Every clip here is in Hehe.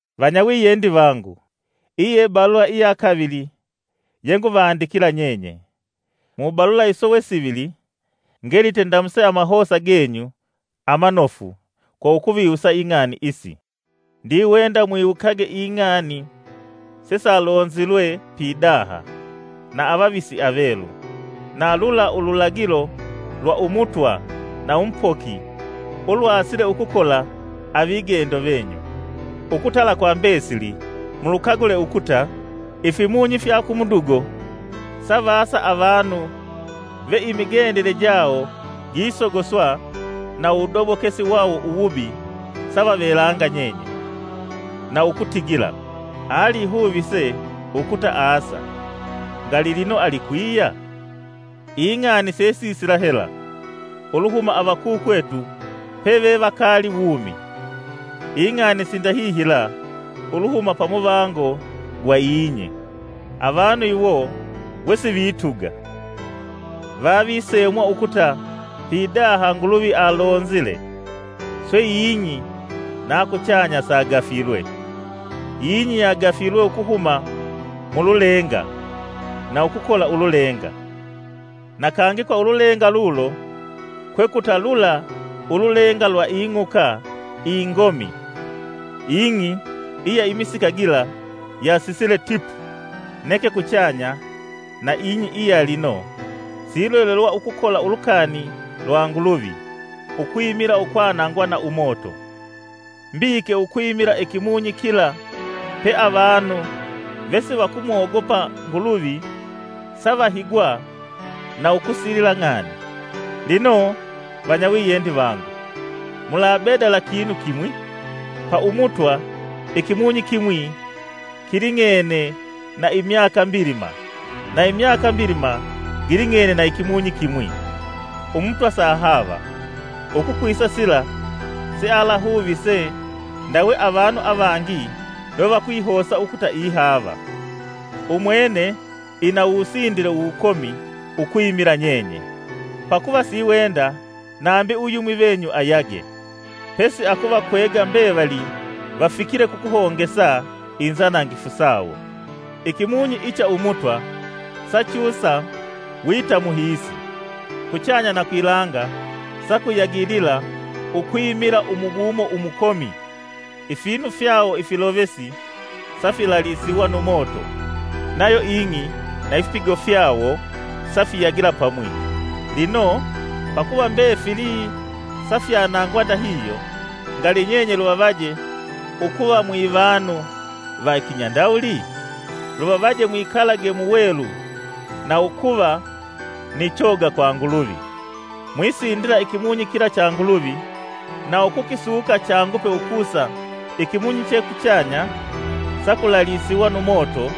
Vanyawiyendi vangu, iyi ye balula iya kavili yenguvandikila nyenye. Mu balula iso we sivili ngelite ndamuse amahosa genyu amanofu kwa ukuviwusa ing'ani isi. Ndiwenda mwiwukage ing'ani sesalonzilwe pidaha na avavisi avelu, na lula ululagilo lwa Umutwa na Umupoki ulwasile ukukola na avigendo venyu. Ukutala kwa mbesili mulukagule ukuta ifimunyi fya kumudugo savasa avanu ve imigendele jawo gisogoswa na uwudobokesi wawo uwubi savavelanga nyenye, na ukutigila: “Alihuvise ukuta aasa! Ngali lino alikwiya? Ing'ani sesisila hela uluhuma avakukwetu pevevakaali wumi; ing'ani sindahihila uluhuma pamuvango gwa ing'i!” Avanu iwo, wesivituga, vavisemwa ukuta pidaha Nguluvi alonzile, swe ing'i na kuchanya sagafilwe. Ing'i yagafilwe ukuhuma mululenga na ukukola ululenga; na kangi kwa ululenga lulo, kwekuta lula ululenga lwa ing'uka ingomi, ing'i iya imisika gila yasisile tipu. Neke kuchanya na ing'i iya lino silolelwa ukukola ulukani lwa Nguluvi ukwimila ukwanangwa na umoto. Mbiike ukwimila Ikimunyi kila pe avanu vesivakumogopa Nguluvi savahigwa na ukusilila ng'ani. Lino, vanyawiyendi vangu, mulabedala kinu kimwi! Pa Umutwa, ikimunyi kimwi kiling'ene na imyaka mbilima na imyaka mbilima giling'ene na ikimunyi ikimwi. Umutwa sahaava ukukwisa sila sealahuvise ndawe avanu avangi lwe vakwihosa ukuta ihaava. Umwene ina uwusindile wukomi ukwimila nyenye, pakuva siiwenda nambi uyumwi venyu ayage, pesi akuvakwega mbevali vafikile kukuhongesa inzanangifu sawo. Ikimunyi icha Umutwa sachusa wita muhiisi. Kuchanya na kwilanga sakuyagilila ukwimila umubumo umukomi, ifinu fyawo ifilovesi safilalisiwa nu moto, nayo ing'i na ifipigo fyawo safiyagila pamwi. Lino pakuva mbefili safyanangwa ndahihyo, ngali nyenye luvavaje ukuva mwivanu va kinyandawuli? Luvavaje mwikalage muwelu na ukuva ni choga kwa Nguluvi, Mwisindila ikimunyi kila cha Nguluvi na ukukisuka changupe ukusa Ikimunyi che kuchanya sakulalisiwa nu moto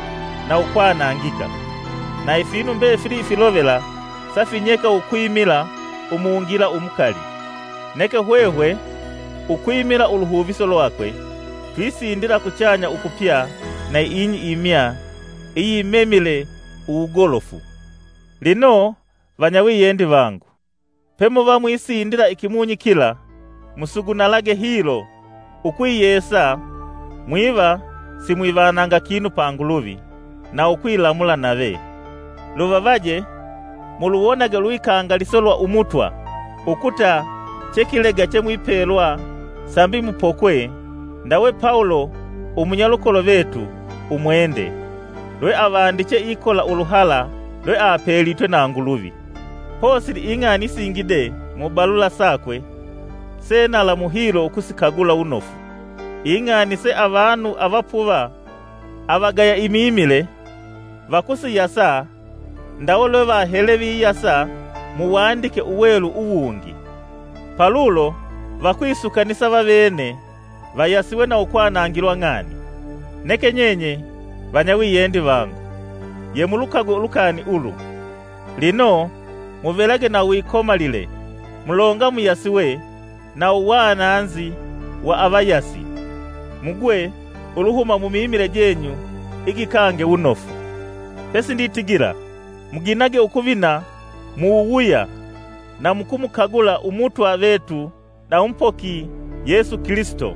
na ukwanangika, na ifinu mbefili ifilovela safinyeka ukwimila umungila umukali. Neke hwehwe ukwimila uluhuviso lwakwe, twisindila kuchanya ukupya na ing'i imya iyimemile uwugolofu. Lino, vanyawiyendi vangu, pemuva mwisindila Ikimunyi kila musugunalage hilo ukwiyesa mwiva simwivananga kinu pa Nguluvi, na ukwilamula nave. Luvavaje muluwonage ulwikangaliso lwa Umutwa ukuta che kilega chemwipelwa sambi mupokwe, ndawe Pawulo umunyalukolo vetu umwende lweavandiche ikola uluhala lweapelitwe na Nguluvi. Posili ing'ani isingi de mubalula sakwe se nalamu hilo ukusikagula wunofu, ing'ani se avanu avapuva, avagaya imimile, vakusiyasa ndawe lwevahele viyasa mu Uwandike Uwelu uwungi. Palulo vakwisukanisa vavene vayasiwe na ukwanangilwa ng'ani. Neke nyenye, vanyawiyendi vangu, yemulukagwe ulukani ulu. Lino, muvelage na uwikomalile mulonga muyasiwe na uwananzi wa avayasi, mugwe uluhuma mumimile jenyu igikange wunofu. Pesi nditigila muginage ukuvina mu wuwuya na mukumukagula Umutwa vetu na Umupoki Yesu Kilisito.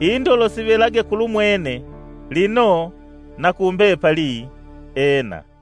Indolo sivelage kulumwene, lino na kumbepali Ena!